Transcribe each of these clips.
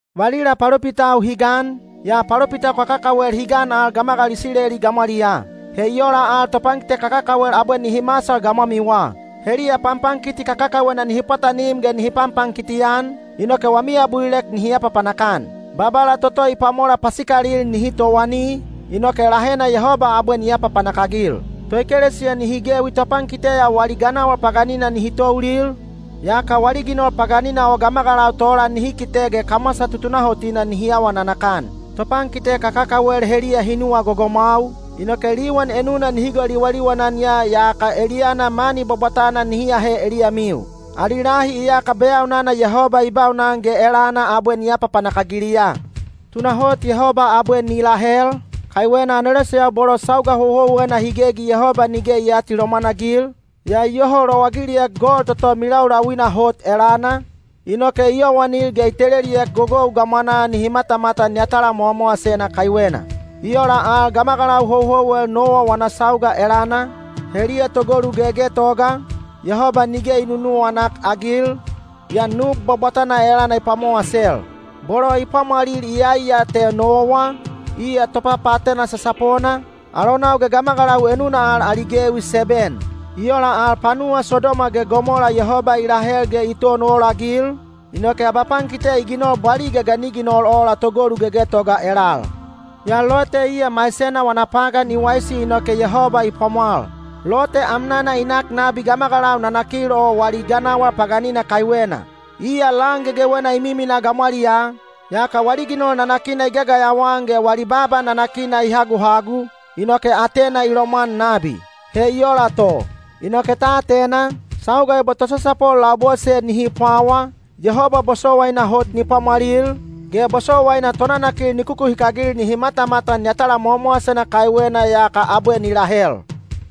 Valila palopitau hi gan, yaa palopitau kakakawel hi gan al gamagalau Isileli gamwaliyaa. He i ola al topankite kakakawel abwe nihi masal gamwamiwa. Heliya panpankiti kakakawena nihi pwatanim ge nihi panpankiti-an, inoke wami abulilek nihi apapanak-an. Babala toto i pwamola pasikalil nihi towani, inoke lahena Yehoba abwe ni apapanak-agil. Toekelesiya nihi gewi topankite ya wali ganawal paganina nihi toulil, yaka wali ginol paganina o gamagalau tola nihi kite ge kamwasa tutunahotina nihi awa nanakan. Topankite kakakawel heliya hi nuwa gogomwau, inoke liwan enuna nihi goliwaliwan-an ya yaka eliyana mani bwabwatana nihi ahe eliyamiu. Ali lahi iyaka beyaunana Yehoba i baunan ge elana abwe ni apapanak-agiliya. Tunahot Yehoba abwe ni lahel, kaiwena aneloseyau bolo sauga houhouwena hi gegi Yehoba nige i aatilomwan-agil, yaa i yoho lowagiliek gol toto milaulauina hot elana, inoke i yowanil ge i teleliek gogou gamwanaa nihi matamatan yatala mowamowasena kaiwena. I ola al gamagalau houhouwel Nowa wana sauga elana, heliya togolu gegetoga, Yehoba nige i nunuwanak-agil, yaa nub bwabwatana elana i pwamowasel. Bolo i pwamwalil iyai ya te Nowa, iya topapaatena sasapona, alonau ge gamagalau enuna al ali gewi seben. I ola al panuwa Sodoma ge Gomola Yehoba i lahel ge i ton olagil, inoke abapankite i ginol bwaliga ga ni ginol ola togolu gegetoga elal. Yaa Lote iya maisena wana pagan i waisi inoke Yehoba i pwamwal. Lote amnana i nak nabi gamagalau nanakil o wali ganawal paganina kaiwena. Iya lan gegewena i miminaa gamwaliyaa, yaka wali ginol nanakina i gagayawa-an ge wali baaba nanakina i haguhagu, inoke atena i lomwan nabi. He i ola to, inoke ta atena, sauga ebo tosasapol labose nihi pwawa, Yehoba bosowaina hot ni pwamwalil, ge bosowaina tonanakil ni kukuhikagil nihi matamatan yatala mowamowasena kaiwena yaka abwe ni lahel.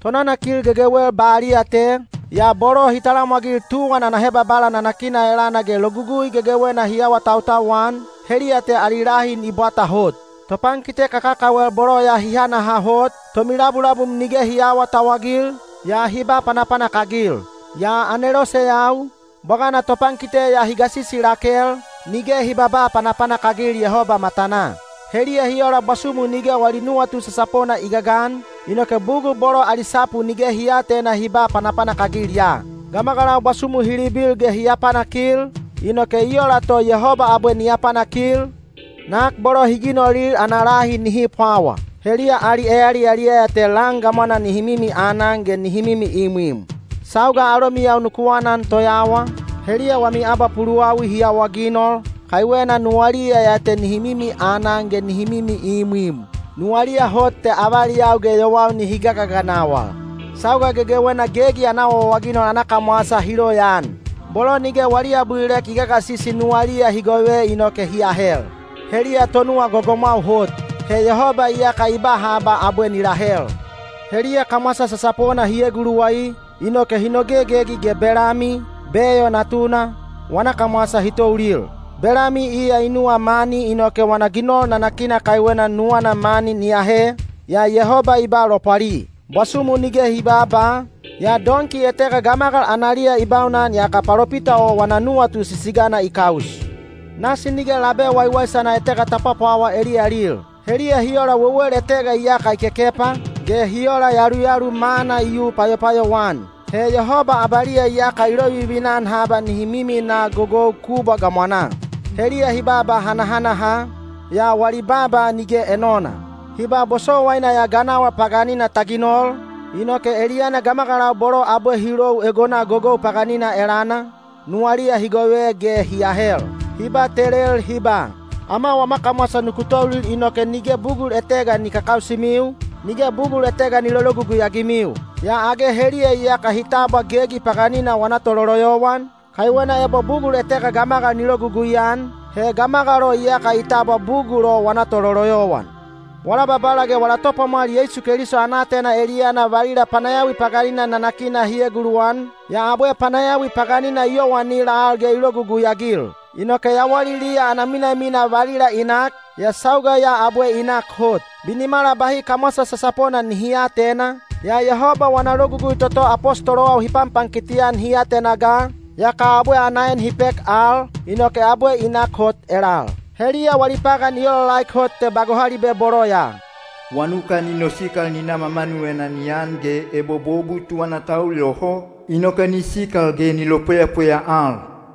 Tonanakil gegewel baliya te, yaa bolo hi talamwagil tuwan ana hebabala nanakina elana ge logugui gegewena hi awatautau-an, heliya te ali lahi ni bwata hot. Topankite kakakawel bolo ya hi hanaha hot, tomilabulabum nige hi aawatauwagil, yaa hi ba panapanak-agil. Yaa aneloseyau, bwagana topankite ya hi gasisi lakel, nige hi babaa panapanak-agil Yehoba matanaa. Heliya hi ola bwasumu nige wali nuwatu sasapona i gagan, inoke bugul bolo ali sapu nige hi aatena hi ba panapanak-agil ya. Gamagalau bwasumu hi libil ge hi apanakil, inoke i ola to Yehoba abwe ni apanakil, nak bolo hi ginolil ana lahi nihi pwawa. Heliya ali eyaliyaliyaya te lan gamwanaa nihi mimi anan ge nihi mimi imwim. Sauga alomiyau ku anan toyawa, heliya wami abapuluwawi hi awaginol, kaiwena nuwaliya ya te nihi mimi anan ge nihi mimi imwim. Nuwaliya hot te avaliyau ge yowau nihi gagaganawal. Sauga gegewena gegi ana awaawaginol ana kamwasa hi loyaan. Bolo nige wali abulilek i gagasisi nuwaliya hi gove inoke hi ahel. Heliya tonuwa gogomwau hot. He Yehoba iyaka i ba haba abwe ni lahel. Heliya kamwasa sasapona hi eguluwai, inoke hi nogegegi ge Belami, Beo natuna, wana kamwasa hi toulil. Belami iya i nuwa mani inoke wana ginol nanakina kaiwena nuwana mani ni ahe, yaa Yehoba i ba lopwali. Bwasumu nige hi baaba, yaa donki etega gamagal analiya i baunan yaka palopita o wana nuwatu sisigana i kaus. Nasi nige labe waiwaisana etega ta pwapwawa eliyalil. Heliya hi ola wewel etega iyaka i kekepa, ge hi ola yaluyalu mana i yu payopayou-an. He Yehoba abaliya iyaka i lovivina-an haba nihi miminaa gogou kubwa gamwanaa. Heliya hi babaa hanahanaha, yaa wali baaba nige enona. Hi ba bosowaina ya ganawal paganina ta ginol, inoke eliyana gamagalau bolo abwe hi lou egona gogou paganina elana, nuwaliya hi gove ge hi ahel. Hi batelel hi ba, “Ama wama kamwasa nuku toulil inoke nige bugul etega ni kakausimiu, nige bugul etega ni lologugui-agimiu.” Yaa age heliya iyaka hi tabwa gegi paganina wana tololoyowan, kaiwena ebo bugul etega gamagal ni logugui-an, he gamagal o iyaka i tabwa bugul o wana tololoyowan. Wala Babala ge wala Topwamwal Yeisu Keliso ana aatena eliyana valila panayawi paganina nanakina hi eguluwan, yaa abwe panayawi paganina i yowanil al ge i logugui-agil. Inoke yawaliliya ana minamina valila i nak, yaa sauga ya abwe i nak hot. Binimala bahi kamwasa sasapona nihi aatena, yaa Yehoba wana logugui toto apostolowau hi panpankiti-an hi atena ga, yaka abwe ana en hi pek al, inoke abwe i nak hot elal. Heliya wali pagan i olaolaek hot te ba gohalibe bolo ya: “Wanuka ni nosikal ni na mamanuvena ni an” ge “Ebo bobu tuwana ta ul yoho, inoke ni sikal ge ni lopweyapweya al.”